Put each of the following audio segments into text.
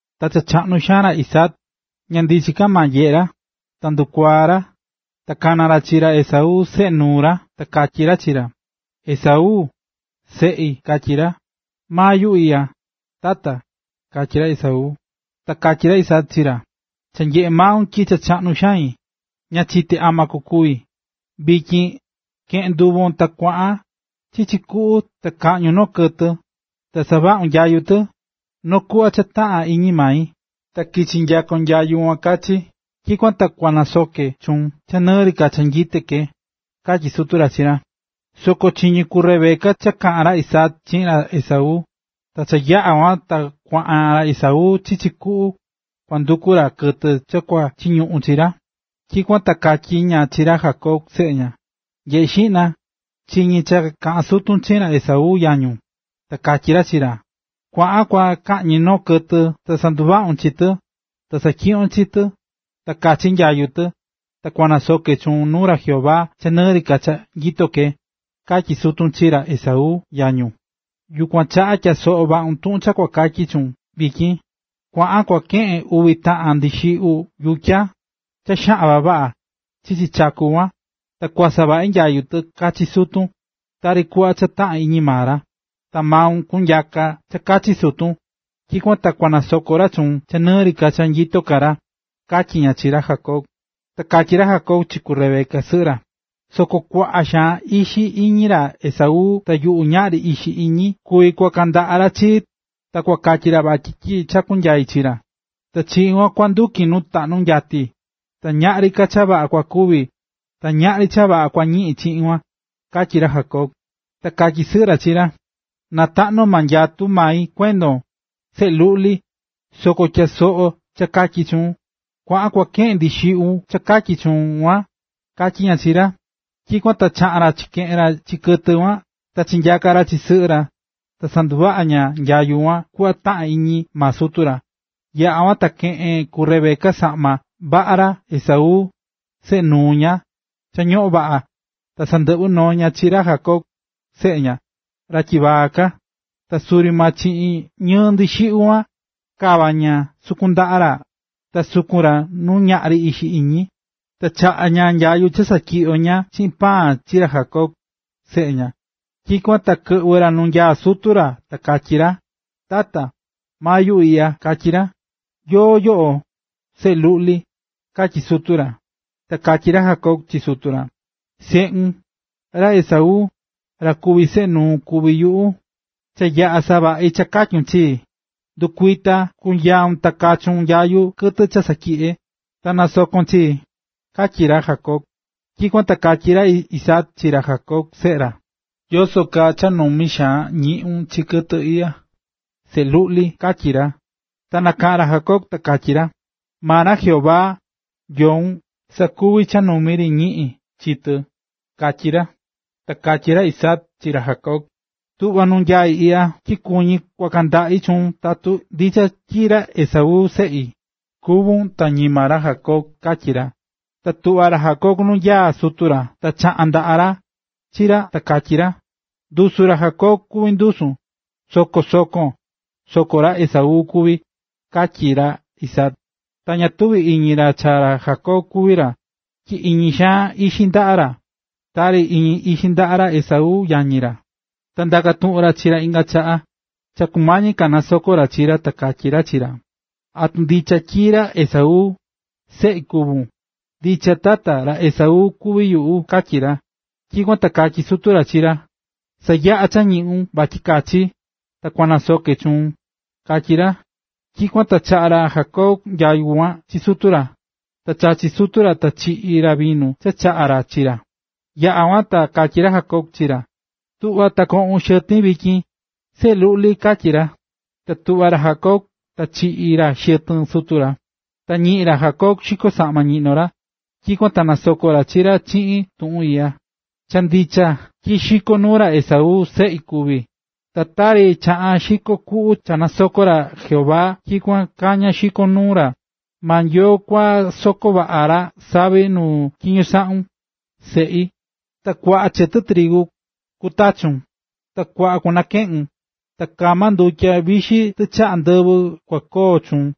Ta cha chaꞌnu xaan ra Isaac, ña ndichin ka maa nyeꞌé ra, ta ndukuaa̱ ra, ta kana̱ ra chi ra Esaú, seꞌe nuu ra, ta katyí ra chi ra: ―¡Esaú! seꞌi ―katyí ra. ―Maa yuꞌu iꞌya, tata ―katyí ra Esaú. Ta katyí ra Isaac chi ra: ―Cha nyeꞌé maun tyi cha chaꞌnu xain, ta ña chité ama kukúvi. Vityin, ke̱ꞌen nduvon, ta kua̱ꞌan chichi kuꞌu ta kaꞌñun noo kɨtɨ, ta savaꞌun nyayu tɨ, noo kuꞌva cha taꞌán iñi mai, ta kichi nyakon nyayu kuan kachi, tyikuan ta kua nasoke chuun cha nɨɨ ri ka cha nyito ke ―katyí sutu ra chi ra. Soko chiñí ku Rebeca cha kaꞌán ra Isaac chiꞌin ra Esaú. Ta cha yaꞌa̱ kuan ta kuaꞌan ra Esaú chichi kuꞌu kua nduku ra kɨtɨ cha kua chiñuꞌun chi ra, tyikuan ta katyí ña chi ra Jacob, seꞌe ña: ―Nyeꞌe̱ xiꞌna, chiñi̱ cha kaꞌán sutun chiꞌin ra Esaú, yañun, ta katyí ra chi ra: “Kua̱ꞌan kua kaꞌñi noo kɨtɨ ta sanduvaꞌun chi tɨ, ta satyiꞌyon chi tɨ, ta kachi nyayu tɨ, ta kunasoke chuun nuu ra Jehová cha nɨɨ ri ka cha nyito ke”, katyí sutun chi ra Esaú, yañun. Yukuan chaꞌa tyaa soꞌo vaꞌun tuꞌun cha kua katyi chuun vityin. Kua̱ꞌan kua keꞌen uvi taꞌan ndixiꞌyu yutya, cha xaꞌan vavaꞌa, chichi chaku kuan, ta kua savaꞌi nyayu kachi sutun, tari kuꞌva cha taꞌán iñi maa ra. Ta maun kunyaka cha kachi sutun, tyikuan ta kua nasoko ra chuun cha nɨɨ ri ka cha nyito ka ra ―katyí ña chi ra Jacob. Ta katyí ra Jacob chi ku Rebeca, sɨꞌɨ ra: ―Soko kuaꞌa xaan ixi iñí ra Esaú ta yuꞌu ñaꞌri ixi iñí. Kuvi kuaka ndaꞌa suti chii, ta kua katyi ra tyi chakú nyai chi ra, ta chiꞌin kuan kua nduki nu taꞌnu nyati, ta ñaꞌri cha vaꞌa kua ñiꞌin chiꞌin kuan ―katyí ra Jacob. Ta katyí sɨꞌɨ ra chi ra: ―Na taꞌnu nyatu mai kuendon, seꞌe luꞌli, soko tya̱soꞌo cha katyí chuun, kua̱ꞌan kua keꞌen ndixiꞌyu cha katyí chuun kuan ―katyí ña chi ra. Tyikuan ta chaꞌa̱n ra chikeꞌe̱n ra chi kɨtɨ kuan ta chinyaka̱ ra chi sɨꞌɨ ra, ta sanduvaꞌa̱ ña nyayu kuan kuꞌva cha taꞌán iñi maa sutu ra. Yaꞌa̱ kuan ta keꞌe̱n ku Rebeca saꞌma vaꞌa ra Esaú, seꞌe nuu ña, cha ñoꞌón vaꞌa, ta sandɨꞌvɨ̱ noo ña chi ra Jacob, seꞌe ña, ra tyivaa ka. Ta suri maa chiꞌin ñɨɨ ndixiꞌyu kuan, kava̱ ña sukun ndaꞌa ra ta sukun ra nu ñaꞌri ixi iñí. Ta chaꞌa̱ ña nyayu cha satyiꞌyo̱ ña chiꞌin paan chi ra Jacob, seꞌe ña. Tyikuan ta kɨꞌvɨ̱ ra nu nyaá sutu ra ta katyí ra: ―Tata, maa yuꞌu iꞌya ―katyí ra. ―¿Yóó yoꞌo, seꞌe luꞌli? ―katyí sutu ra. Ta katyí ra Jacob chi sutu ra: ―Seꞌun, ra Esaú, ra kuví seꞌe nuun kuví yuꞌu. Cha yaꞌa̱ savaꞌi̱ cha katyu̱n chii. Ndu̱kuita ta kunyaun ta kachun nyayu kɨtɨ cha satyiꞌye̱, ta na̱soko chii ―katyí ra Jacob. Tyikuan ta katyí ra Isaac chi ra Jacob seꞌe ra: ―¿Yoso kaa cha numi xaan ñiꞌu̱n chi kɨtɨ iꞌya, seꞌe luꞌli? ―katyí ra. Ta nakaꞌa̱n ra Jacob, ta katyí ra: ―Maa ra Jehová, Nyoun, sakuvi̱ cha numi ri ñiꞌi̱n chi tɨ ―katyí ra. Ta katyí ra Isaac chi ra Jacob: ―Tu̱ꞌva nu nyaí iꞌya, tyi kuñí kuaka ndaꞌi chuun tatun ndicha tyi ra Esaú, seꞌi, kuvún ta ñima ra Jacob ―katyí ra. Ta tuꞌva̱ ra Jacob nu nyaá sutu ra, ta chaka̱ ndaꞌa ra chi ra, ta katyí ra: “Ndusu ra Jacob kuví ndusun, soko sokon, soko ra Esaú kuví”, katyí ra Isaac. Ta ña tuvi̱ iñi ra cha ra Jacob kuví ra, tyi iñí xaan ixi ndaꞌa ra, tari iñí ixi ndaꞌa ra Esaú, yañi ra. Ta ndaka̱ tuꞌun ra chi ra inga chaꞌa cha kumañi ka nasoko ra chi ra, ta katyí ra chi ra: ―¿Atu ndichon tyi ra Esaú, seꞌi, kuvún? ―Ndicha, Tata, ra Esaú kuví yuꞌu ―katyí ra. Tyikuan ta katyí sutu ra chi ra: ―Sa̱yaꞌa cha ñiꞌun vatyi kachi, ta kua nasoke chuun ―katyí ra. Tyikuan ta chaꞌa̱ ra Jacob nyayu kuan chi sutu ra, ta chachi̱ sutu ra ta chiꞌi̱ ra vinu cha chaꞌa̱ ra chi ra. Yaꞌa̱ kuan ta katyí ra Isaac chi ra: ―Tu̱ꞌva ta koꞌun xɨtin vityin, seꞌe luꞌli ―katyí ra. Ta tuꞌva̱ ra Jacob ta chiꞌi̱ ra xɨtɨn sutu ra. Ta ñiꞌi̱n ra Isaac xiko saꞌma ñiꞌnó ra, tyikuan ta nasoko̱ ra chi ra chiꞌin tuꞌun iꞌya: “Cha ndicha, tyi xiko nuu ra Esaú, seꞌi, kuví, ta tari chaꞌán xiko kuꞌu cha nasokó ra Jehová, tyikuan kaa kañá xiko nuu ra. Maa Nyoo kua sakoon vaꞌa ra savi nu tyiño saꞌún, seꞌi. Ta kuaꞌa chɨtɨ trigu kutachun, ta kuaꞌa kunakeꞌun. Ta kama ndutya vixi tichaꞌa ndɨvɨ kua koo chuun.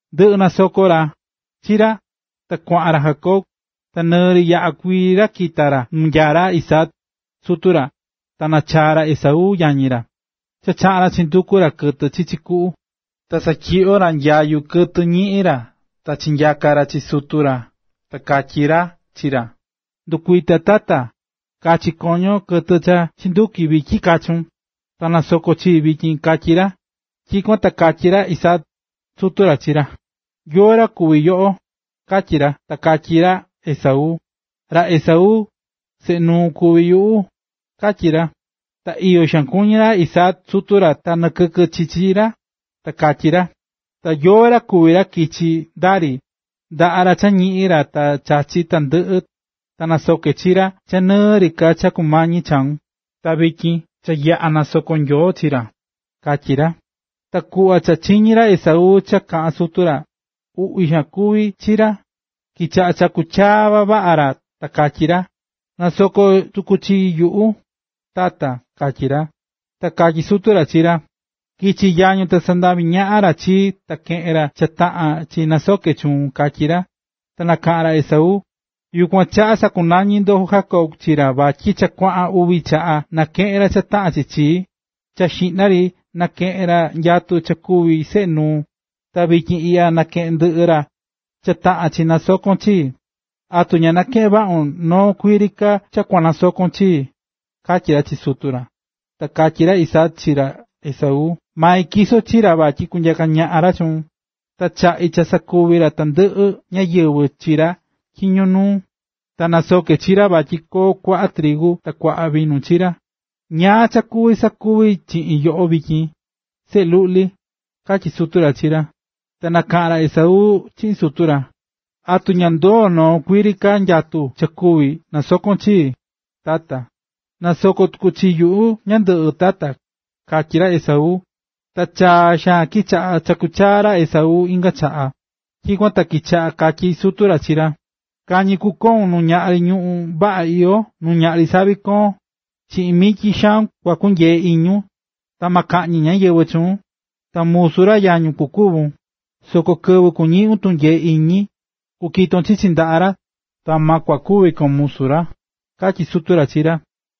Ndɨꞌɨ̱ nasoko̱ ra chi ra, ta kuaꞌan ra Jacob, ta nɨ yaꞌa kuii ri kita̱ ra nu nyaá ra Isaac, sutu ra, ta nachaa̱ ra Esaú, yañi ra, cha chaꞌa̱n ra chinduku̱ ra kɨtɨ chichi kuꞌu. Ta satyiꞌyo̱ ra nyayu kɨtɨ ñiꞌi̱n ra ta chinyaka̱ ra chi sutu ra ta katyí ra chi ra: ―Ndu̱kuita Tata, ka̱chi koño kɨtɨ cha chinduki̱ vityin kachun, ta na̱soko chii vityin ―katyí ra. Tyikuan ta katyí ra Isaac, sutu ra, chi ra: ―¿Yóó ra kuvi yoꞌo? ―katyí ra. Ta katyí ra Esaú: ―Ra Esaú, seꞌe nuun kuví yuꞌu, ―katyí ra. Ta iyo xaan kuñí ra Isaac sutu ra ta nakɨkɨ chi chi ra, ta katyí ra: ―¿Ta yóó ra kuví ra kichi̱ ndari, ndaꞌá ra cha ñiꞌi̱n ra ta chachi̱ tandɨꞌɨ, ta nasoke̱ chi ra cha nɨɨ ri ka cha kumañi chaun? Ta vityin cha nyaa̱ cha nasoko̱ Nyoo chi ra ―katyí ra. Ta kuꞌva cha chiñi̱ ra Esaú cha kaꞌa̱n sutu ra, uꞌvi xaan kuvi̱ chi ra, kichaꞌa̱ chakú chaa vavaꞌa ra ta katyí ra: ―¡Na̱soko tuku chi yuꞌu, Tata!―katyí ra. Ta katyí sutu ra chi ra: ―Kichi̱ yañun ta sandavi̱ ñaꞌan ra chii ta keꞌe̱n ra cha taꞌán chi nasoke chuun ―katyí ra. Ta nakaꞌa̱n ra Esaú: ―Yukuan chaꞌa sakunañi̱ ndo Jacob chi ra vatyi cha kuaꞌan uvi chaꞌa nakeꞌe̱n ra cha taꞌán chi chii: Cha xiꞌna ri nakeꞌe̱n ra nyatu cha kuví seꞌe nuu, ta vityin iꞌya nakeꞌe̱n ndɨꞌɨ ra cha taꞌán chi nasokon chii. ¿Atu ña nakeꞌe̱n vaꞌun noo kuii ri ka cha kua nasokon chii? ―katyí ra chi sutu ra. Ta katyí ra Isaac chi ra Esaú: ―Mai tyiso̱ chi ra vatyi kunyaka ñaꞌan ra chuun, ta chaꞌi̱ cha sakuvi tandɨꞌɨ ñáyɨvɨ chi ra tyiño nuu ra. Ta nasoke̱ chi ra vatyi koo kuaꞌa trigu ta vinu chi ra. ¿Ñáá ka cha kuvi sakuvi chiꞌin yoꞌo vityin, seꞌe luꞌli?―katyí sutu ra chi ra. Ta nakaꞌa̱n ra Esaú chiꞌin sutu ra: ―¿Atu ña ndoo noo kuii ri ka nyatu cha kuví nasokon chii, tata? ¡Na̱soko tuku chi yuꞌu ñandɨꞌɨ, tata! ―katyí ra Esaú. Ta chaa xaan kichaꞌa̱ chakú chaa ra Esaú inga chaꞌa. Tyikuan ta kichaꞌa katyí sutu ra chi ra: “Kañi kukoun nu ñaꞌri ñuꞌún vaꞌa iyó nu ñaꞌri savi koón, Chiꞌin mityi xaun kua kunyee iñun, ta ma kaꞌñi ñáyɨvɨ chuun, ta musu ra yañun kukuvun, soko kɨvɨ kuñiꞌun tunyee iñi, kukiton ndaꞌa ra, ta ma kua kuvi kon musu ra”, katyí sutu ra chi ra.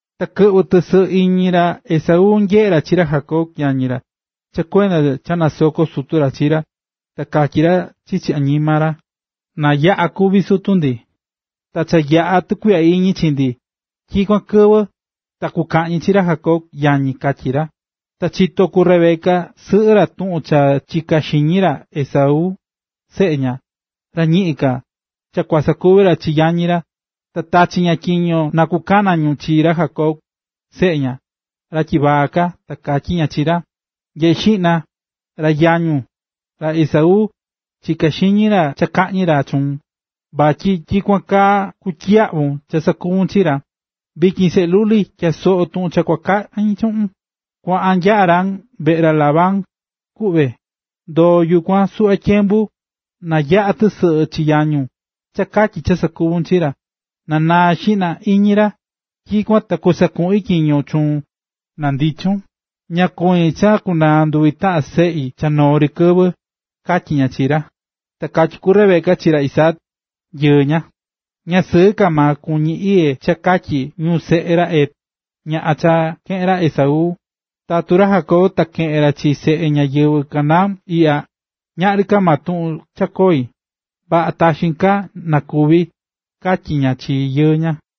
Ta kɨꞌvɨ̱ tɨsɨꞌɨ iñi ra Esaú nyeꞌé ra chi ra Jacob, yañi ra, cha kuenda cha nasoko̱ sutu ra chi ra, ta katyí ra chichi añima ra: “Na yaꞌa̱ kúvi sutu ndi, ta cha yaꞌa̱ tukuiꞌya iñi chi ndi, tyikuan kɨvɨ, ta kukaꞌñi chi ra Jacob, yañi”, katyí ra. Cha chito̱ ku Rebeca sɨꞌɨ ra tuꞌun cha chiká xiñi ra Esaú, seꞌe ña, ra cha ñiꞌin ka, cha kua sakuvi ra chi yañi ra, ta tachi̱ ña tyiño na kukana ñu chi ra Jacob, seꞌe ña, ra tyivaa ka, ta katyí ña chi ra: ―Nye̱ꞌe xiꞌna, ra yañun, ra Esaú, chiká xiñi ra cha kaꞌñi ra chuun, vatyi tyikuan kaa kutyiyaꞌvun cha sakuvu̱n chi ra, na. Vityin, seꞌe luꞌli, tya̱a soꞌo tuꞌun kua kaꞌin chuꞌun. Kua̱ꞌan nya Harán veꞌe ra Labán, kuꞌve. Ndo̱o yukuan suꞌva tyembu, na yaꞌa̱ tɨsɨꞌɨ chi yañun cha katyi cha sakuvu̱n chi ra, na naa xiꞌna iñi ra, tyikuan ta kusakuꞌin tyiño chuun na ndichun. ¡Ña kuñí cha kunaa nduvi taꞌan seꞌi cha noo ri kɨvɨ! ―katyí ña chi ra. Ta katyí ku Rebeca chi ra Isaac, yɨɨ ña: ―Ña sɨɨ ka maa kuñí iyé cha katyi ñu seꞌe ra Het, ñaꞌan cha keꞌe̱n ra Esaú. Tatu ra Jacob ta keꞌen ra chi seꞌe ñáyɨvɨ Canaán iꞌya, ñaꞌri ka tuꞌun cha koi, vaꞌa taxin ka na kúvi ―katyí ña chi yɨɨ ña.